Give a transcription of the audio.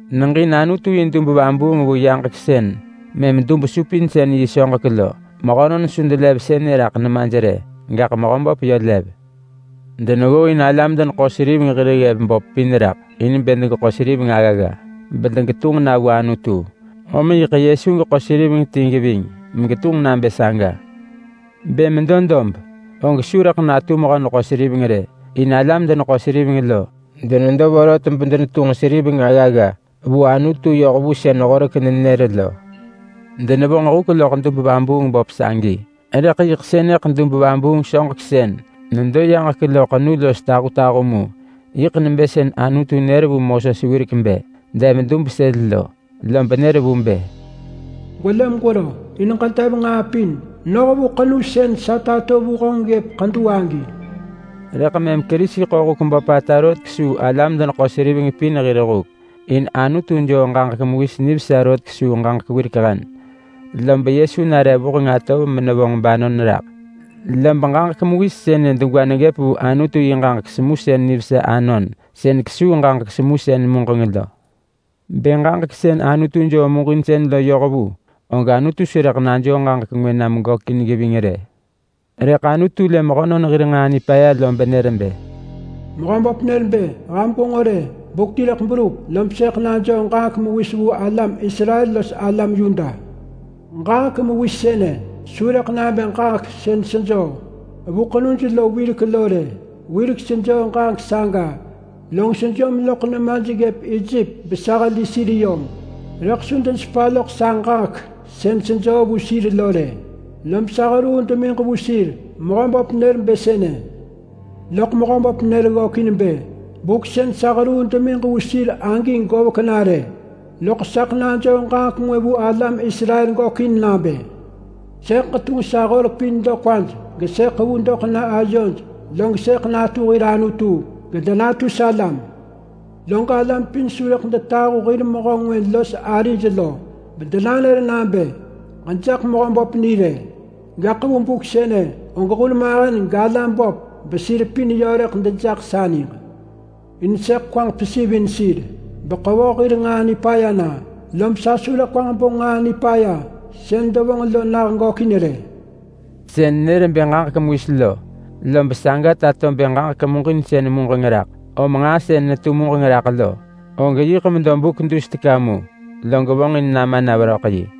Neġin Anutu yi dub vabuung vu yaġek sën mëm dub-supinsën-yi soġek lo. Mehönon su delev sënë raḳ nemaj rë, gaḳ Mehöböp yö lev. Deneggooin alam-deneḳo-seriveng hir ggev böp pin raḳ in bë degeḳo seriveng aggagga bedegetunġ na vu Anutu. Om yiḳ Yesu geḳo seriveng ti geving megetunġ nabë saga. Bë medo dob, og su rëḳ natu mehö-neḳo-seriveng rë. In alam-deneḳo-seriveng lo, denedo vorot bedenetunġ seriveng aggagga vu Anutu yoh vu sën Horek nenër lo. Denevonġ huk loḳ dub-vabuung-böp sagi, rëḳ yiḳ sënëḳ dub-vabuung soġek sën nedo yaġek lo ḳenu los tahutahu mu. Yiḳ nebë sën Anutu nër vu Moses wirek bë dev dub sël lo lob nër vu bë, “Gwelë megwero in ġedev nġaa pin noh vu ḳenu sën sa tato vu honġ ggëp ḳedu agi.” Rëḳ mëm Kerisi ḳo huk böpata rot kesuu alam-deneḳo-seriveng pin hir huk. In Anutu joo ġaġek mewis nivesa rot kesuu ġaġek wirek hen, lob Yesu nare vuheng atov menevonġ banon raḳ. Lob ġaġek mewis sënë degwa neggëp vu Anutu yi ġaġek semusën nivesa anon sën kesuu ġaġek semusën muġeng lo. Bë ġaġek sën Anutu joo muġinsën lo yoh vu, og Anutu su rëḳ najoo ġaġek ngwë nam gökin geving rë. Rëḳ Anutu lë mehönon hir nġaa nipaya lob nër bë: “Mehöböp nër bë, ‘Ham gwenġo rë! Buk ti rëḳ berup lob sëḳ najoo ġaġek mewis vu alam Israel los alam Yuda. Ġaġek mewis sënë su rëḳ nabë ġaġek sën sejoo vu ḳenuj lo wirek lo rë. Wirek sejoo ġaġek saga, log sejom loḳ nemaj ggëp Ejep besa heli sir yom. Rëḳ su denesepa loḳ sa ġaġek sën sejoo vu sir lo rë, lob sa heruu demiġ vu sir.’ Mehöböp nër bë sënë. Loḳ Mehöböp nër ggökin bë, ‘Buk sën sa heruu demiġ vu sir agi govek na rë, loḳ saḳ najoo ġaġek ngwë vu alam Israel gökin nabë: Sëḳ ġetunġ sa horek pin doḳ kwaj gesëḳ ḳevu doḳ na ayoj, log sëḳ natu hir Anutu gedenatu salam. Log alam pin su rëḳ detahu hir mehö ngwë los arij lo bedenanër nabë, “Ġejaḳ Mehöböp ni” rë! Gaḳ vu buk sënë, og hurmahen galam böp besir pin yö rëḳ dejaḳ sa niġ. In sëḳ kwaġ pesivin sir beḳevoh hir nġaa nipaya na, lob sa su rëḳ kwaġ bo nġaa nipaya sën devonġ lo nah gökin rë.’” Sën nër bë ġaġek mewis lo, lob saga tato bë ġaġek muġinsën muġeng raḳ. Om nġaa sën netu muġeng raḳ lo, og yiḳ medo buk dus teka mu log vonġin nama na veröḳ yi.